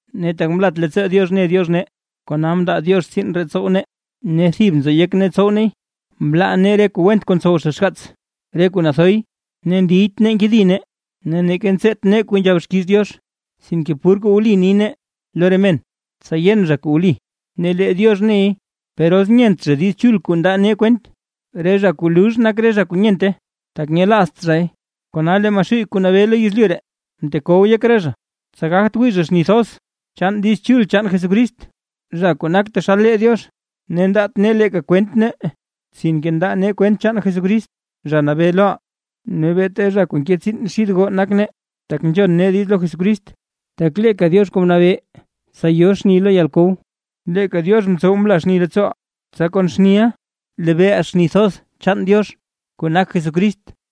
Ne tak mlat leettsoo Diox ne Diox nee, kona mndaa Diox tsiin ree ntsow nee, ne thib nzo yek nee tsow neey. Mlaa nee re kuu went kuu ntsow zha xgaats, re kuu nathoy, ne ndiyt nee nkedi nee, ne neeka ntseet nee kuu nzhab xkiiz Diox. Sinke pur kuu wli ni nee lo re men, tsa yen zha kuu wli; ne lee Diox ney. Per os nyent zha Diiz Chul kuu ndaa nee kwent, re zha kuu lux nak re zha kuu nyente. Tak nyelaazt zhay, kona lee Maxuuy kuu nabee lo yezlyu ree, mtekow yek re zha, tsa gagt wii zha xni thoz chaan Diiz Chul chaan Jesucrist, zha kuu nak taxal lee Diox. Ne ndaat nee leeka kwent nee, sinke ndaa nee kwent chaan Jesucrist Zha Nabee loʼaa. Ne beeta zha kuu nke tsiin xid goo nak nee, tak nzhon nee diiz lo Jesucrist. Tak leeka Diox kuu mnabee tsa yo xni lo yalkow, leeka Diox mtsow mla xni leettsooʼaa, tsa kon xniʼa lebeeʼaa xni thoz chaan Diox, kuu nak Jesucrist.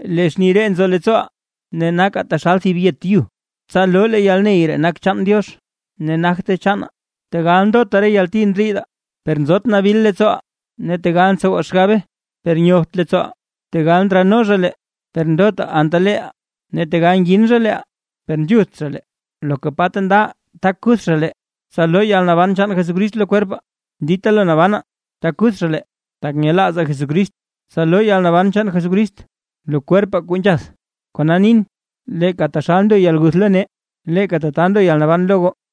Lee xni ree nzo leettsooʼaa. Ne nakaa taxal thib yet yu, tsa loo lee yalney ree nak chaan Diox ne nagte chaanaa. Tegal ndota re yalti ndriidaa, per nzot nabil leettsooʼaa, ne tegal ntsowaa xgabe per nyobt leettsooʼaa. Tegal ndralno zha lee, per ndot anta leeʼaa, ne tegal ngin zha leeʼaa per nzhutht zha lee. Loka pa ta nda re lee tak kuth zha lee, tsa loo yalnaban chaan Jesucrist lo kwerpaa. Dita lo nabanaa tak kuth zha lee tak nyelaazaa Jesucrist, tsa loo yalnaban chaan Jesucrist lo kwerpaa kuu nzhath. Kona nin, leeka taxal ndo yalguth lo nee, leeka tata ndo yalnaban lo goo.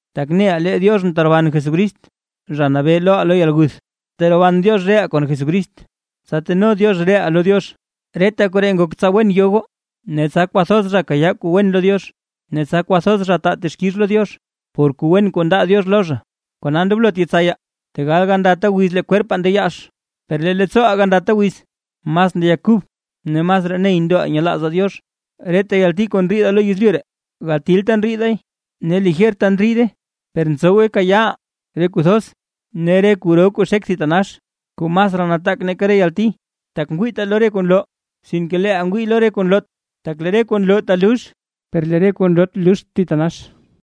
Tak neʼaa lee Diox mteroban Jesucrist, Zha Nabee loʼaa lo yalguth, kona neʼaa teroban Diox reʼaa kon Jesucrist, tsa teno Diox reʼaa lo Diox. Reta koree ngok tsa wen yo goo, ne tsa kwathoz zha kayaa kuu wen lo Diox; ne tsa kwathoz zha taa texkix lo Diox por kuu wen kuu ndaa Diox lo zha. Kona ndoblot yetsayaa. Tegal gandata wiz lee kwerpaa ndeyaax, per lee leettsooʼaa gandata wiz mas ngeyak kub ne masraa ney ndoʼaa nyelaazaa Diox. Reta yalti kuu ndriidaa lo yezlyu ree gatilta ndriidaay, ne lijerta ndriide, per ntsowe kayaaʼaa re kuu thoz ne re kuu ro kuu xek thitanax kuu masraa nataak nake re yalti. Tak ngwiitaa lo re kuu nloo, sinke leeʼaa ngwii lo re kuu nloot; tak lee re kuu nloo talux, per lee re kuu nloot luxt thitanax.